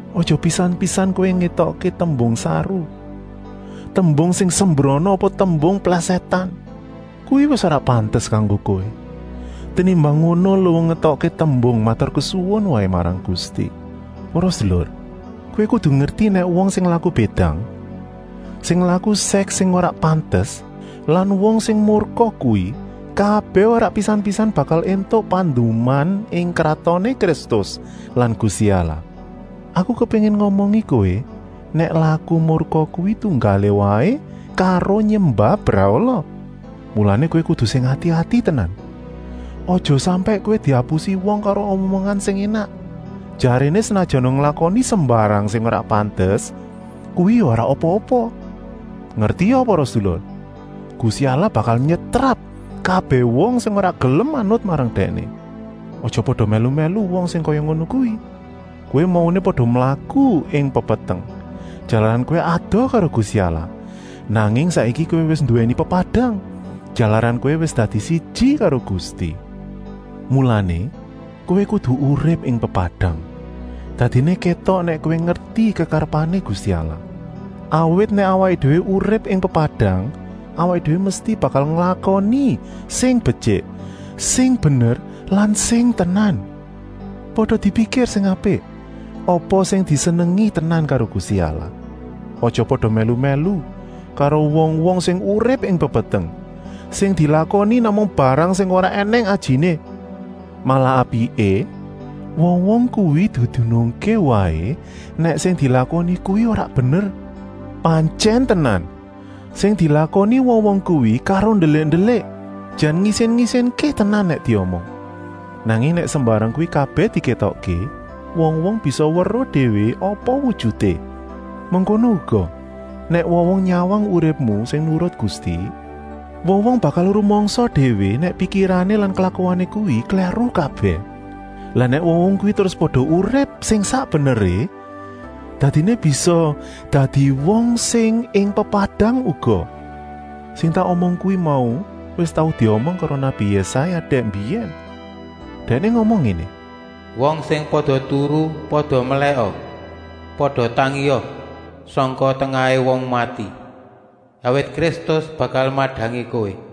Aja pisan-pisan kowé ngetokké tembung saru, tembung sing sembrana apa tembung plèsètan. Kuwi wis ora pantes kanggo kowé. Tenimbang ngono luwung ngetokké tembung maturkesuwun waé marang Gusti. Para sedulur, kowé kudu ngerti nèk wong sing laku bédang, sing laku sèks sing ora pantes lan wong sing murka kuwi kabèh ora pisan-pisan bakal éntuk panduman ing Kratoné Kristus lan Gusti Allah. Aku kepéngin ngomongi kowé nèk laku murka kuwi tunggalé waé karo nyembah brahala. Mulané kowé kudu sing ati-ati tenan, aja sampèk kowé diapusi wong karo omongan sing énak, jaréné senajana nglakoni sembarang sing ora pantes kuwi ya ora apa-apa. Ngertia para sedulur, Gusti Allah bakal nyetrap kabèh wong sing ora gelem manut marang Dèkné. Aja pada mèlu-mèlu wong sing kaya ngono kuwi. Kowé mauné pada mlaku ing pepeteng, jalaran kowé adoh karo Gusti Allah, nanging saiki kowé wis nduwèni pepadang, jalaran kowé wis dadi siji karo Gusti. Mulané, kowé kudu urip ing pepadang, dadiné kétok nèk kowé ngerti kekarepané Gusti Allah. Awit nèk awaké déwé urip ing pepadang, awaké déwé mesti bakal nglakoni sing betyik, sing bener lan sing tenan. Pada dipikir sing apik apa sing disenengi tenan karo Gusti Allah. Aja pada mèlu-mèlu karo wong-wong sing urip ing pepeteng, sing dilakoni namung barang sing ora ènèng ajiné. Malah apiké, wong-wong kuwi didunungké waé nèk sing dilakoni kuwi ora bener. Pantyèn tenan, sing dilakoni wong-wong kuwi karo ndelik-ndelik jan ngisin-isinké tenan nèk diomong. Nanging nèk sembarang kuwi kabèh dikétokké, wong-wong bisa weruh déwé apa wujuté. Mengkono uga, nèk wong-wong nyawang uripmu sing nurut Gusti, wong-wong bakal rumangsa déwé nèk pikirané lan klakuané kuwi klèru kabèh. Lah nèk wong-wong kuwi terus pada urip sing sak beneré, dadiné bisa dadi wong sing ing pepadang uga. Sing tak omong kuwi mau wis tau diomong karo nabi Yésaya dèk mbiyèn. Dèkné ngomong ngéné: “Wong sing pada turu, pada melèka, pada tangia sangka tengahé wong mati, awit Kristus bakal madangi kowé.”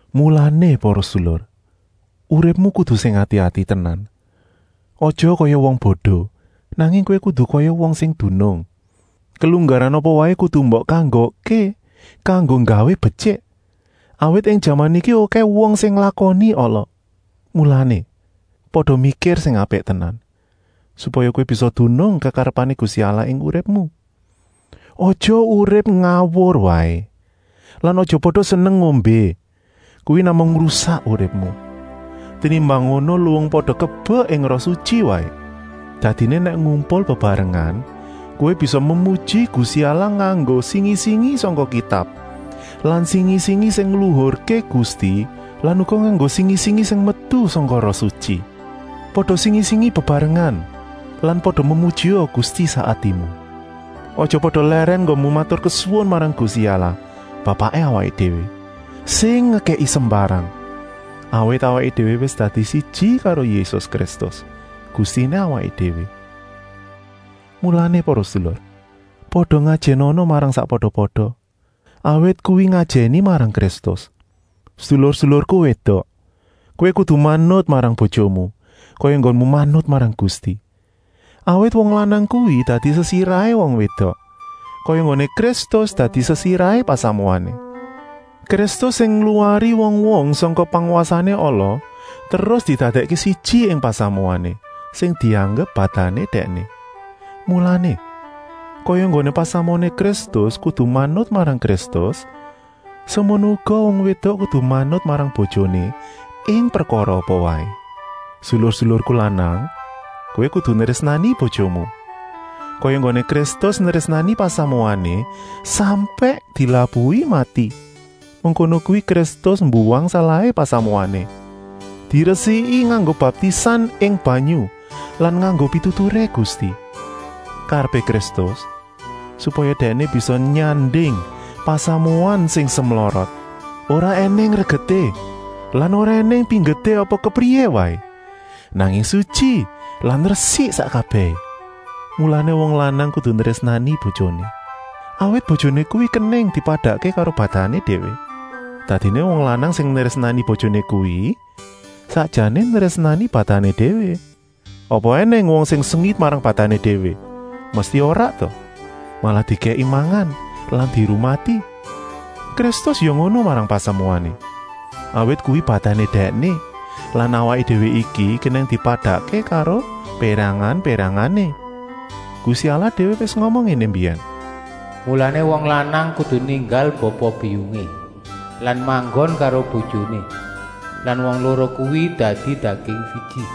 Mulané, para sedulur, uripmu kudu sing ati-ati tenan. Aja kaya wong bodo, nanging kowé kudu kaya wong sing dunung. Kelunggaran apa waé kudu mbok kanggokké kanggo nggawé betyik, awit ing jaman iki okèh wong sing nglakoni ala. Mulané, pada mikir sing apik tenan, supaya kowé bisa dunung kekarepané Gusti Allah ing uripmu. Aja urip ngawur waé. Lan aja pada seneng ngombé, kuwi namung ngrusak uripmu. Tenimbang ngono luwung pada kebek ing Roh Sutyi waé. Dadiné nèk ngumpul bebarengan kowé bisa memuji Gusti Allah nganggo singi-singi sangka Kitab lan singi-singi sing ngluhurké Gusti lan uga nganggo singi-singi sing metu sangka Roh Sutyi. Pada singi-singi bebarengan lan pada memujia Gusti sak atimu. Aja pada lèrèn enggonmu maturkesuwun marang Gusti Allah Bapaké awaké déwé, sing ngekèki sembarang, awit awaké déwé wis dadi siji karo Yésus Kristus, Gustiné awaké déwé. Mulané, para sedulur, pada ngajènana marang sakpada-pada, awit kuwi ngajèni marang Kristus. Sedulur-sedulurku wédok, kowé kudu manut marang bojomu, kaya enggonmu manut marang Gusti. Awit wong lanang kuwi dadi sesirahé wong wédok, kaya enggoné Kristus dadi sesirahé pasamuané. Kristus sing ngluwari wong-wong sangka pangwasané ala terus didadèkké siji ing pasamuané, sing dianggep badané Dèkné. Mulané, kaya enggoné pasamuané Kristus kudu manut marang Kristus, semono uga wong wédok kudu manut marang bojoné ing prekara apa waé. Sedulur-sedulurku lanang, kowé kudu nrésnani bojomu, kaya enggoné Kristus nrésnani pasamuané, sampèk dilabuhi mati. Mengkono kuwi Kristus mbuwang salahé pasamuané, diresiki nganggo baptisan ing banyu lan nganggo pituturé Gusti. Karepé Kristus, supaya Dèkné bisa nyanding pasamuan sing semlorot, ora ènèng regeté lan ora ènèng pinggeté apa kepriyé waé, nanging sutyi lan resik sak kabèhé. Mulané wong lanang kudu nrésnani bojoné, awit bojoné kuwi kenèng dipadakké karo badané déwé. Dadiné wong lanang sing nrésnani bojoné kuwi sakjané nrésnani badané déwé. Apa ènèng wong sing sengit marang badané déwé, mesti ora ta, malah dikèki mangan lan dirumati. Kristus ya ngono marang pasamuané, awit kuwi badané Dèkné lan awaké déwé iki kenèng dipadakké karo pérangan-pérangané. Gusti Allah déwé wis ngomong ngéné mbiyèn: “Mulané wong lanang kudu ninggal bapa-biyungé lan manggon karo bojoné, lan wong loro kuwi dadi daging siji.”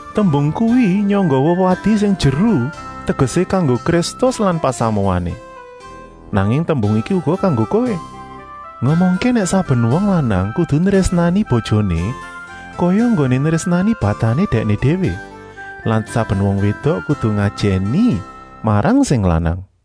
Tembung kuwi nyangga wewadi sing jeru tegesé kanggo Kristus lan pasamuané. Nanging tembung iki uga kanggo kowé, ngomongké nèk saben wong lanang kudu nrésnani bojoné kaya enggoné nrésnani badané dèkné déwé lan saben wong wédok kudu ngajèni marang sing lanang.